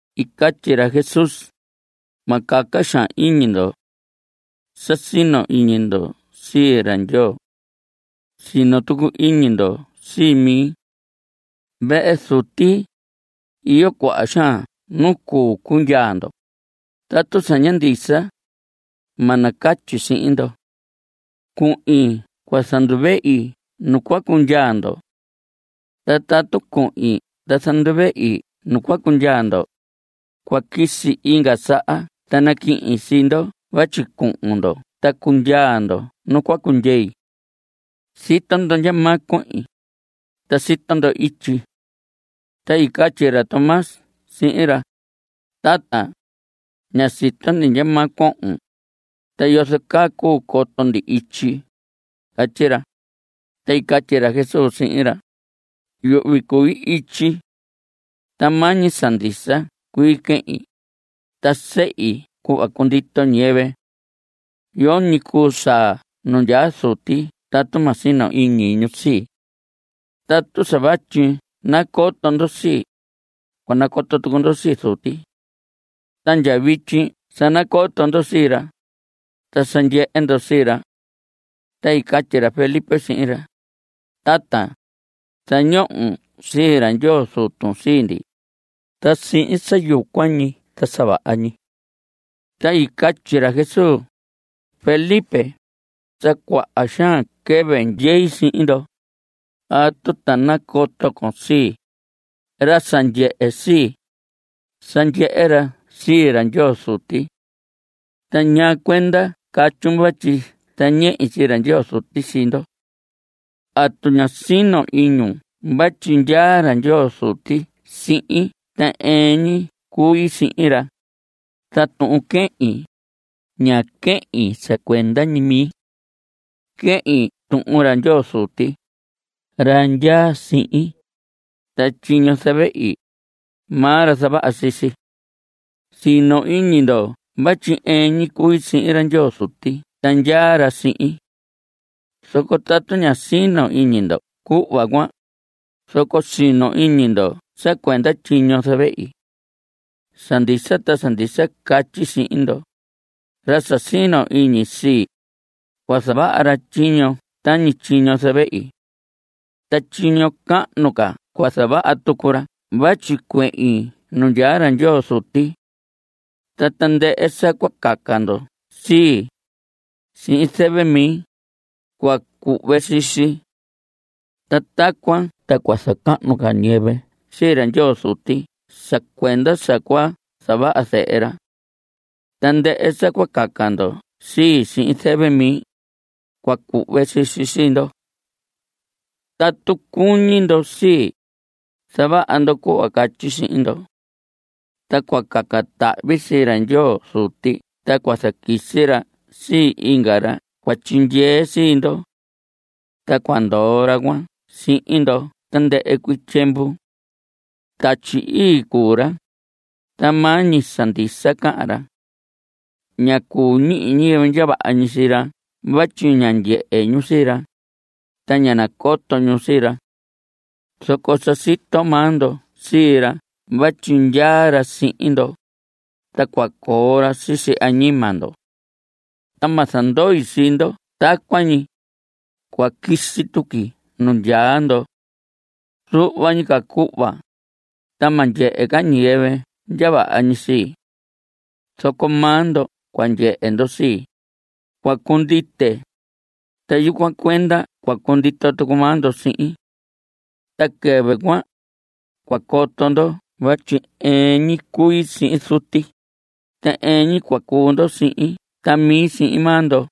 I catyi ra Jesús: Ma caca xaan iñi ndo. Sa sino iñi ndo sii ra Ndyoo. Sino tucu iñi ndo sii mi. Vehe Zuti, iyo cuaha xaan nu cuu cundyaa ndo. Tatu sa ña ndisa, ma nacatyi sihin ndo. Cuhin cua zanduvehi nu cua cundyaa ndo. Ta tatu cuhin ta zanduvehi nu cua cundyaa ndo, cua quisi inga saha ta naquihin sii ndo vatyi cuhun ndo ta cundyaa ndo nu cua cundyei. Sito ndo ndyamaa cuehin, ta sito ndo ityi. Ta i catyi ra Tomás sihin ra: Tata, ña sito ndi ndyamaa cuohon ¿ta yozo caa cuu coto ndi ityi? Catyi ra. Ta i catyi ra Jesús sihin ra: Yuhvi cui ityi. Ta maa ñi sa ndisa cuii quehin, ta sehi cuhva cundito ñiyɨvɨ. Yoñi cuu saa nu ndyaa Zuti tatu ma sino iñi ñu sii. Tatu sa vatyi nacoto ndo sii, nacoto tucu ndo sii Zuti. Ta ndya vityi sa nacoto ndo sii ra, ta sa ndyehe ndo sii ra. Ta i catyi ra Felipe sihin ra: Tata, zañohon sii ra Ndyoo Zutun sii ndi. Ta sihin sa yucuan ñi ta sa vaha ñi. Ta i catyi ra Jesús: Felipe, sa cuaha xaan quɨvɨ ndyei sihin ndo. ¿Atu ta nacoto con sii? Ra sa ndyehe sii, sa ndyehe ra sii ra Ndyoo Zuti. ¿Ta ñaa cuenda catyun vatyi zañehi sii ra Ndyoo Zuti sii ndo? ¿Atu ña sino iñun vatyi ndyaa ra Ndyoo Zuti sihin ta ɨɨn ñi cui sihin ra? Ta tuhun quehin, ña quehin sa cuenda ñi mi. Quehin tuhun ra Ndyoo Zuti, ra ndyaa sihin. Ta tyiño zavehi, maa ra zavaha sii si. Sino iñi ndo vatyi ɨɨn ñi cui sihin ra Ndyoo Zuti ta ndyaa ra sihin. Zoco tatu ña sino iñi ndo cuhva cuan, zoco sino iñi ndo sa cuenda tyiño zavehi. Sa ndisa ta sa ndisa catyi sihin ndo, ra sa sino iñi sii, cua zavaha ra tyiño tañi tyiño zavehi. Ta tyiño cahnu ca cua zavaha tucu ra vatyi cuehin nu ndyaa ra Ndyoo Zuti. Ta tandɨhɨ sa cua caca ndo sii, sihin zɨvɨ mi, cua cuhve sii si. Ta tacuan ta cua zacahnu ca ñiyɨvɨ sii ra Ndyoo Zuti sa cuenda sa cua zavaha Zehe ra. Tandɨhɨ sa cua caca ndo sii, sihin zɨvɨ mi, cua cuhve sii si sii ndo. Tatu cuñi ndo sii, zavaha ndo cuhva catyi sihin ndo. Ta cua caca tahvi sii ra Ndyoo Zuti ta cua zaquisi ra sii inga ra cua tyindyee sii ndo. Ta cua ndoo ra cuan sihin ndo tandɨhɨ cuii tyiemvu. Tatyi Ii cuu ra, ta maa ñi sa ndisa cahan ra. Ña cuu ñihi ñiyɨvɨ ndya vaha ñi sii ra vatyi ña ndyehe ñu sii ra, ta ña nacoto ñu sii ra. Zoco sa sito maa ndo sii ra vatyi ndyaa ra sihin ndo, ta cua coo ra sisi añima ndo. Ta ma zandoi sii ndo tacuan ñi. Cua quisi tuqui nu ndyaa ndo. Zuhva ñi ca cuhva, ta ma ndyehe ca ñiyɨvɨ ndya vaha ñi sii. Zoco maa ndo cua ndyehe ndo sii. Cua cundite, ta yucuan cuenda cua cundito tucu maa ndo sihin. Ta quɨvɨ cuan, cua coto ndo vatyi ɨɨn ñi cui sihin Zuti, ta ɨɨn ñi cua cuu ndo sihin ta mi sihin maa ndo.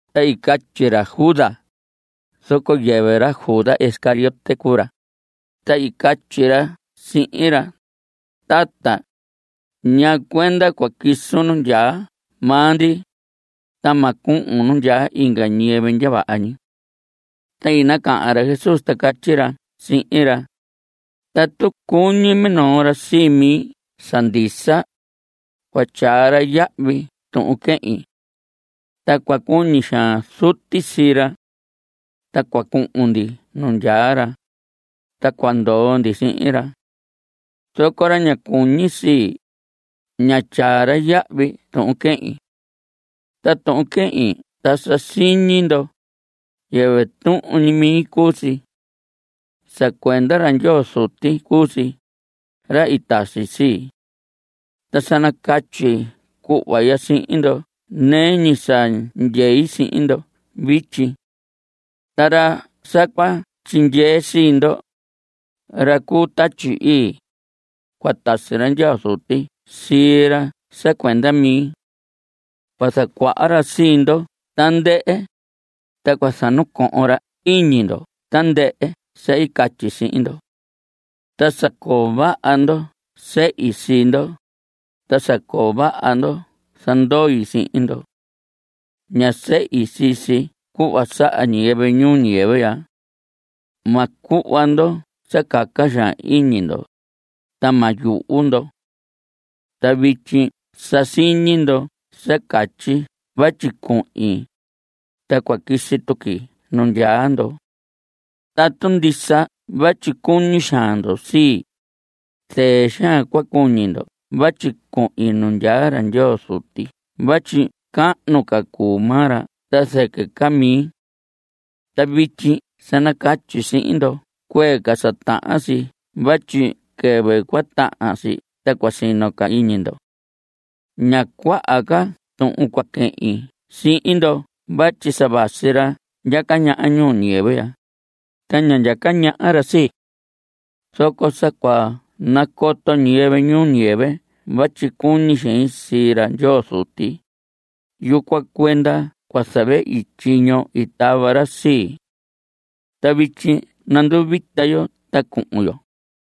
Ta i catyi ra Judas, zoco yɨvɨ ra Judas Iscariote cuu ra, ta i catyi ra sihin ra: Tata, ¿ñaa cuenda cua quisun nu ndyaa maa ndi, ta ma cuhun nu ndyaa inga ñiyɨvɨ ndya vaha ñi? Ta i nacahan ra Jesús ta catyi ra sihin ra: Tatu cuñi minoo ra sii mi sa ndisa, cua tyaa ra yahvi tuhun quehin. Ta cua cuñi xaan Zuti sii ra. Ta cua cuhun ndi nu ndyaa ra, ta cua ndoo ndi sihin ra. Zoco ra ña cuñi sii, ña tyaa ra yahvi tuhun quehin. Ta tuhun quehin ta sa siñi ndo, yɨvɨ tuhun ñi mi cuu si. Sa cuenda ra Ndyoo Zuti cuu si, ra i tasi sii. Ta sa nacatyi cuhva ya sihin ndo nɨɨ ñi sa ndyei sihin ndo vityi. Ta ra sa cua tyindyee sii ndo, ra cu Tatyi Ii, cua tasi ra Ndyoo Zuti sii ra sa cuenda mi. Cua zacuaha ra sii ndo tandɨhɨ. Ta cua zanacohon ra iñi ndo tandɨhɨ sa i catyi sihin ndo. Ta sa coo vaha ndo sehi sii ndo. Ta sa coo vaha ndo zandoi sihin ndo. Ña sehi sii si cuhva saha ñiyɨvɨ ñuu ñiyɨvɨ ya. Ma cuhva ndo sa caca xaan iñi ndo, ta ma yuhu ndo. Ta vityi sa siñi ndo sa catyi vatyi cuhin, ta cua quisi tuqui nu ndyaa ndo. Tatu ndisa vatyi cuñi xaan ndo sii, zɨɨ xaan cua cuñi ndo vatyi cuhin nu ndyaa ra Ndyoo Zuti vatyi cahnu ca cuu maa ra ta zɨquɨ ca mi. Ta vityi sa nacatyi sihin ndo cuee ca sa tahan si vatyi quɨvɨ cua tahan si ta cua sino iñi ndo. Ña cuaha ca tuhun cua quehin sihin ndo vatyi sa vasi ra ndyaca ñaha ñuu ñiyɨvɨ ya, ta ña ndyaca ñaha ra sii. Zoco sa cua nacoto ñiyɨvɨ ñuu ñiyɨvɨ vatyi cuñi xein sii ra Ndyoo Zuti, yucuan cuenda cua zavehi tyiño i tava ra sii. Ta vityi nanduvita yo ta cuhun yo.